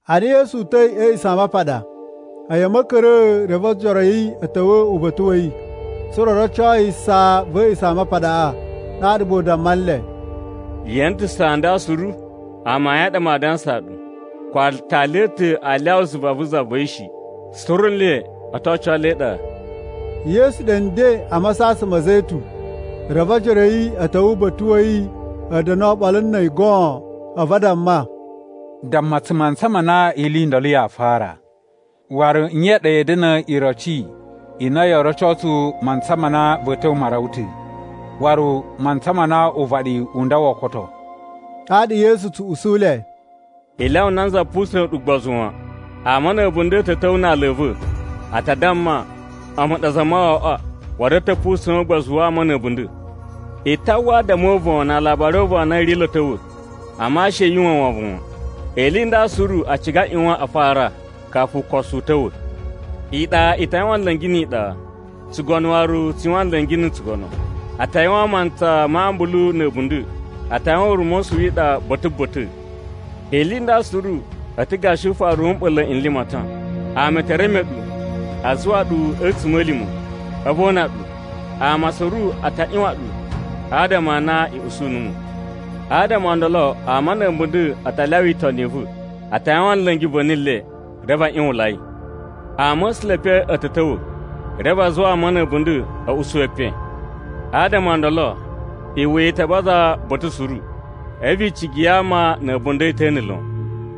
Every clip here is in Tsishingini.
Ana Yesu uta̱i a̱ A̱a̱ꞌisamapaɗa, a̱yi a̱ ma̱ka̱ra̱a̱, a̱vu ojoro a̱ yi a̱ ta̱wa̱ uba̱ta̱ wa̱ yi, tsa̱ra̱ o roco yi saa va̱ A̱a̱ꞌisamapaɗaꞌa. Ɗaɗa gba u damma nle, “Ye ene ta̱ saa nda suru? Amayun a ɗa maa dansaa ɗu, ko aatali a̱ ta̱ aa lyawa zuva vu za va̱ yi shi. Suru nle o to oco le e iɗa.” Yesu ɗe nden a Masasan ma̱ Zetun, reve ojoro a̱ yi a̱ ta̱wa̱ uba̱ta̱ wa̱ yi a̱ da̱na̱ oɓolo na̱ a̱yi goon. A̱vu a damma, “Damma tsu mantsa ma na ili i ndolo yaa fara? Waru nye ya̱a̱ da̱na̱ iroci i na yoo roco tsu mantsa ma na va̱a̱ ta̱wa̱ ma rawa ta̱, waru mantsa ma na uvaɗi u nda woo koto?” Ɗaɗa Yesu tsu usu le, “I lyawa nanza pusa̱n ɗu ugbozu wan. Ama na̱ a̱bunda̱ a̱ ta̱ ta̱wa̱ na aala a̱ va̱, a ta damma, ‘A̱mu ɗa Zamawawaꞌa.’ Waru a̱ ta̱ pusa̱n ugbozu wa ama na̱ a̱bunda̱. I ta uwwa adama o uvon na alabari o uvon a na a̱ ri lo a̱ ta̱wa̱, amma she yu uwwa wovon wan. Ili i nda suru a ciga a ꞌyuwan a fara, kafu ukosu u ta̱wa̱. Iɗa i ta yuwan nla̱ngi ni iɗa, tsugono waru tsu yuwan nla̱ngi na̱ tsugono. A ta yuwan mantsa ma ambulu na̱ a̱bunda̱. A ta yuwan ura̱mosu wi iɗa ba̱ta̱ ba̱ta̱. Ili nda suru a̱ ta̱ gashi ufaru wu mɓa̱la̱ n limatan. “Ama e te reme ɗu, a zuwa ɗu a̱tsuma̱lima̱, a̱vu o una ɗu. Ama suru a ta ꞌyuwan ɗu adama a na i usu numu. Adama o ndolo ama na̱ a̱bunda̱ a ta lyawa itoni i va̱. A ta yuwan nla̱ngi va̱ni le, reve a ꞌyuwunlai. Ama̱sula̱ e epen a̱ ta̱ ta̱wa̱, reve a zuwa ama na̱ a̱bunda̱ a̱ usu epen. Adama o ndolo, iwuya i ta baza ba̱ta̱ suru, a̱vu icigi ya ama na̱ a̱bunda̱ i ta̱na̱ lon.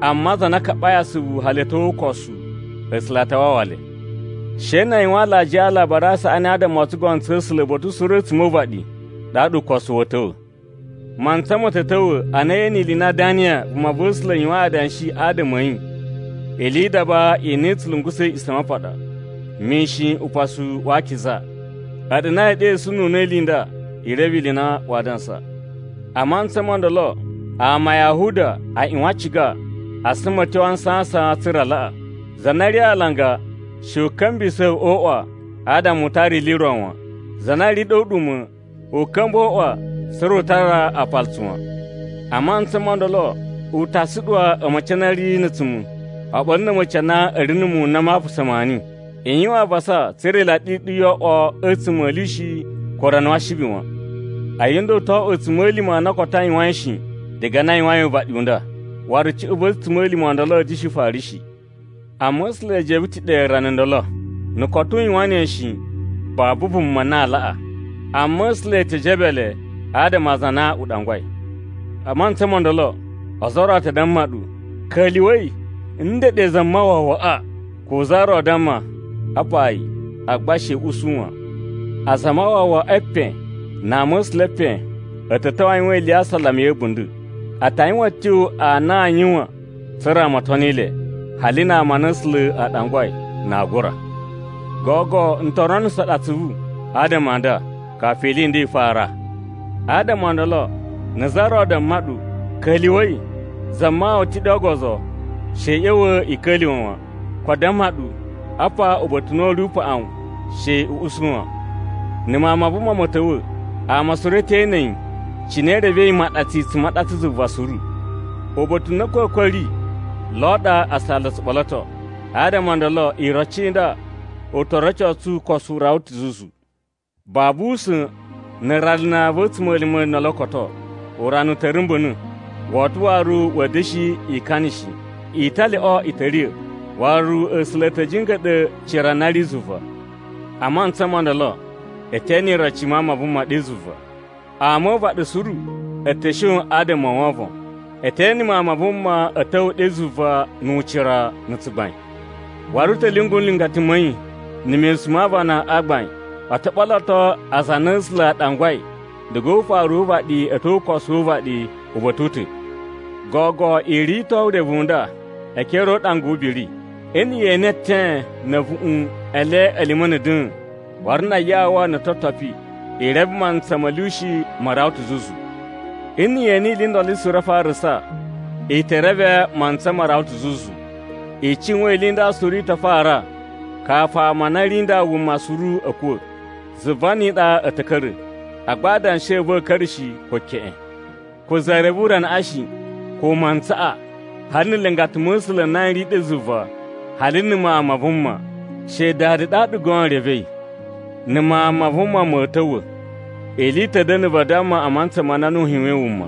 Amma aza a na a kaɓai asuvu hali a̱ tyo o ukosu, A̱sula̱ a ta wawa le. She na a yuwan alajiya a Alabari a Saꞌani adama o tsugono tsa̱ A̱sula̱ uba̱ta̱ suru a̱tsuma̱ o uvaɗi, ɗaɗa ukosu wa̱a̱ ta̱wa̱. “Mantsa ma̱ ta̱ ta̱wa̱ a na ye ene ili i na Daniya vumava̱sula̱ yuwain adanshi adama a̱ yi ‘Ili yi idaba i na i tsu lungusa̱ A̱a̱ꞌisamapaɗa,’ mishin Upasu wa Akiza. (A̱ɗu na yee ɗesununa̱ ili i nda, i reve ili i na waa dansa.) A mantsa mo ndolo, ama a Yahuda a ꞌyuwan a ciga a suma a̱ tyo a nsasan tsa̱ra̱ a laꞌa. Za na ri a alanga, she u ka̱mbisa̱ o uꞌwa adama u tara ili i ro wan. Za na ri ɗe o uɗuma̱, u ka̱mba̱ o uꞌwa tsa̱ra̱ u tara aapalutsu wan. A mantsa mo ndolo, u ta suɗuwa a̱ma̱ci a na a̱ ri na̱ a̱tsuma̱ oɓolo na̱ a̱ma̱ci a na a̱ ri na̱ muwun n na ma apasa maani! “I yuwan avasa tsa̱ra̱ ilaɗi i ɗu yoo oꞌwo a̱tsuma̱ a̱ lyushi ko urana wa Ashibi wan! A̱yi nda u to oꞌwo a̱tsuma̱lima̱ a na koto a yuwain shi, diga na a yuwain uvaɗi u nda. Waru cuꞌun va̱ a̱tsuma̱lima̱ o ndolo a̱a̱ da̱shi fara shi. Amma A̱sula̱ e jebe ta̱ ɗe rana ndolo, na̱ koto u yuwan ne shi, babu vuma na aa laꞌa. Amma A̱sula̱ e te jebe le adama a aza a na u ɗangwai. “A mantsa mo ndolo, ozo o ro a ta damma ɗu, ‘Ka̱lyuwa̱i, ndeɗe Zamawawaꞌa!’ Ko za ro damma, ‘Apa yi’, agba she i usu wan. Azamawawa e epen na ama̱sula̱ e epen a̱ ta̱ ta̱wa̱ a yuwan ili ya asalama ya̱ a̱bunda̱. A ta yuwan a̱tyo a na aa yuwan tsa̱ra̱ ama o toni le, hali na ama a na A̱sula̱ a ɗangwai, na aa gura. Gogo n to ronuso ɗu atsuvu adama a nda, kafu ili i nda i fara. “Adama o ndolo, na̱ za ro damma ɗu, ‘Ka̱lyuwa̱i, Zamawawa ta̱ ɗe o ogozo,’ she i ꞌya̱wa̱ i ka̱lyuwa̱ wan. Ko a damma ɗu, ‘Apa uba̱ta̱ u na u ri upaꞌun,’ she i usu wan! Na̱ Mawun ma Vuma ma̱ ta̱wa̱, ama suru e te ene yi, cine i revei imaɗatsu i tsu maɗatsa zuva suru. Uba̱ta̱ u na a̱kwa̱kwa̱ a̱ ri, lo ɗa asala o tsu ɓoloto, adama o ndolo iroci i nda u to rocosu ukosu u rawa ta̱ zuzu. “Babu usa̱n na̱ rana va̱ a̱tsuma̱lima̱ ndolo koto, ‘Urana u ta̱ rumba̱na̱ Woto waru wa̱a̱ da̱shi ikana shi. Italyoꞌo i ta̱ riya̱, Waru A̱sula̱ a̱ ta̱ jinga̱ɗa̱ cira na ri zuva.’ “A mantsa mo ndolo, e te ene iroci i Mawun ma Vuma ɗe zuva. Ama o uvaɗi suru a̱ ta̱ shon adama o wovon. E te ene Mawun ma Vuma a̱ ta̱wa̱ ɗe zuva nu ucira na̱ tsugbain. Waru u ta̱ lyungu nlingata ma̱ yi na̱ mesun ma aavana a gbain, o to ɓoloto aza a na A̱sula̱ a ɗangwai diga o ufaru wu uvaɗi a̱ tyo o ukosu wu uvaɗi uba̱ta̱ u ta̱. “Gogo i rito urevu u nda e ekere o uɗanga wu ubiri: Nna̱ ye ene eten na̱ a̱vuꞌun e le a̱ lima̱na̱ da̱a̱n, waru na ayawa no ototopi, i reve mantsa ma̱ lyushi ma rawa ta̱ zuzu. Na̱ ye ene ili i ndolo suru a farasa, i te reve mantsa ma rawa ta̱ zuzu. I cuwan ili i nda suru i ta fara kafu ama a na a̱ ri nda wuma suru a̱ kuwa̱. Zuva ni iɗa a̱ ta̱ ka̱ra̱, agba adanshi a̱ va̱ a̱a̱ ka̱ra̱ shi ko keꞌen. “Ko za reve uranaꞌa shi, ko mantsaꞌa, hali na̱ nlingata ma̱ A̱sula̱ n na n ri ɗe zuva hali na̱ Mawun ma Vuma. She Dada ɗa goon revei. Na̱ Mawun ma Vuma ma̱a̱ ta̱wa̱, ili i ta̱ da̱na̱ vadamma a mantsa ma na Nuhu yuwain wuma.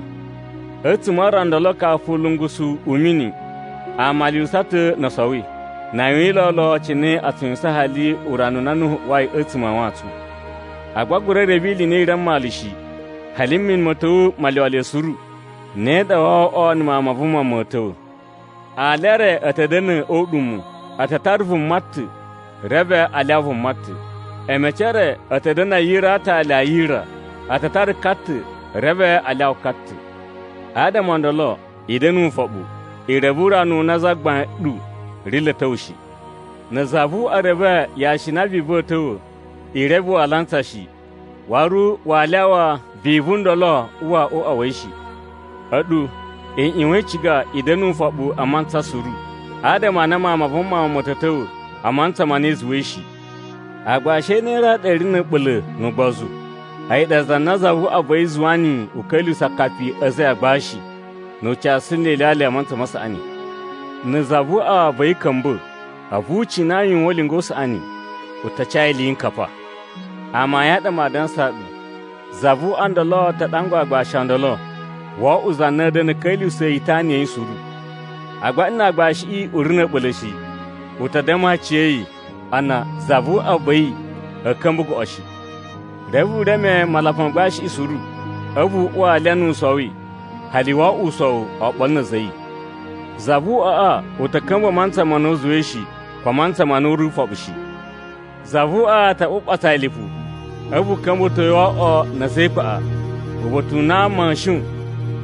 A̱tsuma̱ a rana ndolo kafu u ulungusu u mini, ama a lyuwusa ta̱ no o sowi, na a yuwin lolo cine a tsu yuwusan hali urana u na Nuhu uwai a̱tsuma̱ a wantsun. Agba a gura reve ili i na i ri a mmalu shi, hali mini ma̱ ta̱wa̱ ma lyuwa le suru. Ne ɗa woo oꞌwo na̱ Mawun ma Vuma ma̱ ta̱wa̱. Ali e re a̱ ta̱ da̱na̱ o uɗuma̱. A ta tara vuma ta̱ reve a lyawa vuma ta̱. A̱ma̱ci e re a̱ ta̱ da̱na̱ a yira a aatali a yira. A ta tara ka ta̱ reve a lyawa ka ta̱. “Adama o ndolo, i da̱na̱ ufoɓu, i reve urana u na Zagbain ɗu ri lo a̱ ta̱wa̱ shi. Na̱ za vu uꞌwa reve yashi i na vivu a̱a̱ ta̱wa̱, i reve waa lantsa shi, waru waa lyawa vivu ndolo uwa o uꞌwa wa̱ yi shi. A̱ɗu i ꞌyuwan i ciga i da̱na̱ ufoɓu a mantsa suru. Adama a na Mawun ma Vuma ma̱ ta̱ ta̱wa̱ a mantsa ma na i zuwai shi. “Aagbashi a̱ ne a ɗa a̱ ri na̱ a̱ɓula̱ nu ugbozu? A̱yi ɗa za na zavuꞌwa va̱ yi zuwa niyi u ka̱lyuwusa̱ akapi a̱ a̱za̱ a̱ yi a agbashi, nu u casu nle ilyalya a mantsa ma saꞌani. Na̱ zavuꞌwa va̱ yi ka̱mba̱, a̱vu u cina yi u yuwan ulinga u saꞌani, u ta ca yi iliyinkapa. Amayun a ɗa maa dansaa ɗu, zavuꞌwa ndolo ta ɗangwa aagbashi o ndolo wo oꞌwo za na a̱ da̱na̱ a̱ ka̱lyuwusa̱a̱ yi itana ya̱ yi suru. Agba nna aagbashiꞌi u ri na̱ a̱ɓula̱ shi, u ta damma aciya̱yi a na zavuꞌwa va̱ yi a̱a̱ ka̱mba̱ goꞌo shi. Reve u reme malapa ma agbashiꞌi suru. A̱vu u uwa alya nu u sowi hali wo oꞌwo usowu oɓolo na̱ a̱za̱ a̱ yi. Zavuꞌwaꞌa u ta̱ ka̱mba̱ a mantsa ma na u zuwai shi, ko a mantsa ma na u ri ufoɓu shi. Zavuꞌwa u ta ɓuɓatsa yi lipu, a̱vu u ka̱mba̱to yi wo oꞌwo na̱ a̱za̱ e ikpaꞌa, uba̱ta̱ u na ama a̱a̱ shon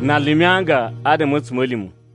na lumi anga adama a̱ a̱tsuma̱lima̱.”